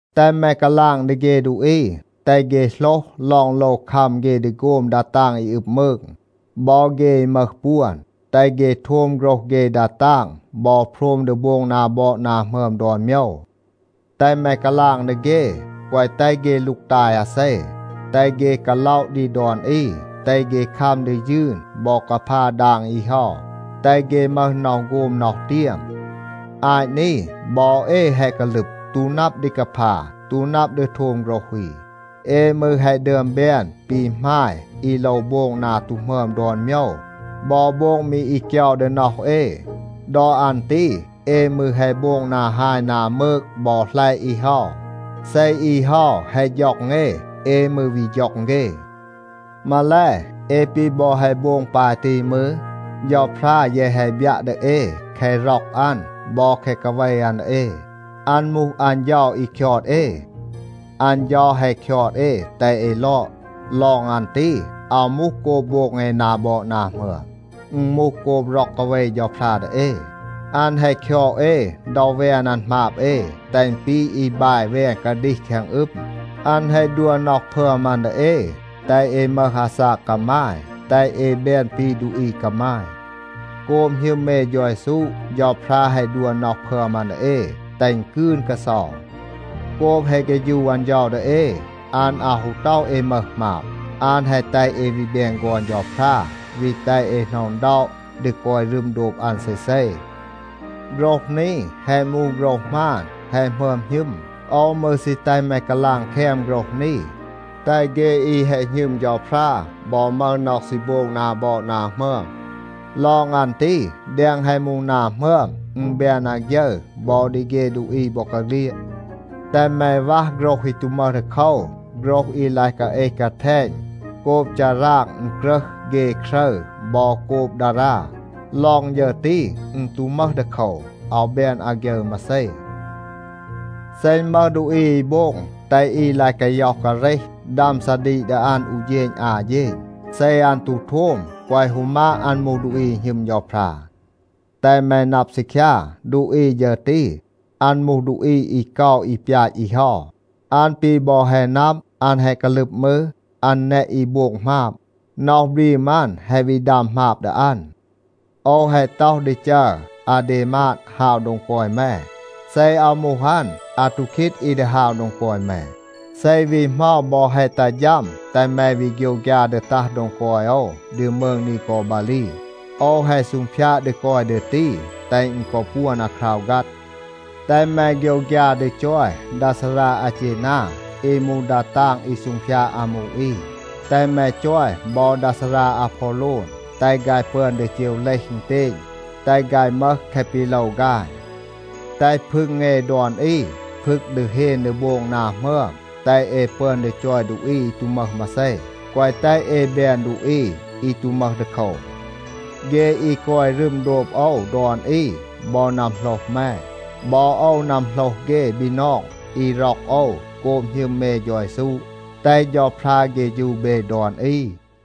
แตห แม กาลาง ดี เฆ ดูอี, แตห เฆ โหลห ลอง โลว คัม เฆ ดี โฆม ดา ตาง อี อึบ มืง, บอ เฆ อี มึห ปวน. แตห เฆ โทม โฆรห เฆ ดา ตาง บอ โพรม ดี โบง นา บอด นา หมึอม ดอน โมยว. แตห แม กาลาง ดี เฆ, แกวะ แตห เฆ ลูกตาย อาเซ. แตห เฆ กาล็อะ ดี ดอน อี, แตห เฆ คัม ดี ยืน บอ กาพา ดาง อี เฮา, แตห เฆ มึห น็อห โฆม น็อห เตียม. อาต นี บอ เอ แฮะ กาลึบ, ตู นับ ดี กาพา, ตู นับ ดี โทม โฆรห อี. เอ มืร แฮะ ดึอม แบน ปี หมาย อี โลว โบง นา ตู หมึอม ดอน โมยว บอ โบง มี อี เกยา ดี น็อห เอ. ดอ อัน ตี เอ มืร แฮะ โบง นา ฮาย นา มืก บอ หลัยะ อี เฮา. เซ อี เฮา แฮะ ฌ็อง เอ, เอ มืร วี ฌ็อง เฆ. มาแล, เอ ปี บอ แฮะ โบง ปาย ตี มืร, เฌาพรา แยะ แฮะ บยัะ ดี เอ แคะ ร็อก อัน บอ แคะ กาเว อัน ดี เอ. อัน มูห อัน เฌา อี คยอด เอ. อัน เฌา แฮะ คยอด เอ แตห เอ ลอด. ลอง อัน ตี, อาว มูห โกบ โบง เอ นา บอด นา หมึอม. อึณ มูห โกบ ร็อก กาเว เฌาพรา ดี เอ. อัน แฮะ คยอด เอ ดอ แวน อัน หมาบ เอ, แตห อึณ ปี อี บาย แวน กาดีห แคง อึม. อัน แฮะ ดัว น็อห พึอม อัน ดี เอ, แตห เอ มึห อาซาก กามาย, แตห เอ แบน ปี ดูอี กามาย. โกบ หณึม เอ เฌา เยซู, เฌาพรา แฮะ ดัว น็อห พึอม อัน ดี เอ, แตห อึณ กืน กาเซา. โกบ แฮะ เฆฌู อัน เฌา ดี เอ, อัน อาว ฮู ต็อห เอ มึห หมาบ. อัน แฮะ แตห เอ วี แบน ฆอน เฌาพรา, วี แตห เอ หน็อะ อึณด็อะ ดี กอย รึม โดบ อัน เซเซ. โฆรห นี แฮะ มูห โฆรห หมาน, แฮะ หมึอม หณึม. โอว มืร ซี แตห แม กาลาง แคม โฆรห นี, แตห เฆ อี แฮะ หณึม เฌาพรา บอ มึห น็อห ซี โบง นา บอด นา หมึอม. ลอง อัน ตี, แดง แฮะ มูห นา หมึอม, อึณ แบน อาฆยึร บอ ดี เฆ ดูอี บอกาเฆลียด. แตห แม วัห โฆรห อี ตู มึห ดีโคว, โฆรห อี ลาย กาเอห กาแทณ โกบ ฌาราง อึณกรึห เฆ ครึร บอ โกบ ดารา. ลอง ฌึร ตี, อึณ ตู มึห ดีโคว. อาว แบน อาฆยึร มาเซ. เซ อึณ มึห ดูอี อี โบง แตห อี ลาย กาย็อห กาเรห, ดัม ซาดีก ดี อัน อู เฌณ อา เฌณ. เซ อัน ตู โทม, แกวะ ฮู มาด อัน มูห ดูอี อี หณึม เฌาพรา. แตห แม นับ ซีคยา, ดูอี ฌึร ตี, อัน มูห ดูอี อี เกา อี ปยาต อี เฮา. อัน ปี บอ แฮะ นับ, อัน แฮะ กาลึบ มืร, อัน แนะ อี โบง หมาบ. น็อห บรีม อัน แฮะ วี ดัม หมาบ ดี อัน. โอว แฮะ ต็อห ดี จัร อาเดมาด ฮาว โดง กอย แม. เซ อาว มูห อัน, อาทูคีด อี ดี ฮาว โดง กอย แม. เซ วี เหมา บอ แฮะ ตัห ฌัม, แตห แม วี โฆยวฆยา ดี ตัห โดง กอย โอว ดี มืง นีกอบาลี. โอว แฮะ ซูงพยาด ดี กอย ดี ตี, แตห อึณ กอ ปวน อาคราว ฆัด. แตห แม โฆยวฆยา ดี จอย ดา ซารา อาเจนา อี มูห ดา ตาง อี ซูงพยาด อามู อี. แตห แม จอย บอ ดา ซารา อาพอโลน. แตห ฆาย ปึอน ดี เจว เลห อึณเตณ, แตห ฆาย มึห แคะ ปี โลว ฆาย. แตห พึง เอ ดอน อี พึก ดี เฮน ดี โบง นา หมึอม, แตห เอ ปึอน ดี จอย ดูอี อี ตู มึห มาเซ. แกวะ แตห เอ แบน ดูอี อี ตู มึห ดีโคว. เฆ อี กอย รึม โดบ โอว ดอน อี บอ นัมโหลห แม. บอ โอว นัมโหลห เฆ บีนอง อี ร็อก โอว โกบ หณึม เอ เฌา เยซู. แตห เฌาพรา เฆฌู เบ ดอน อี.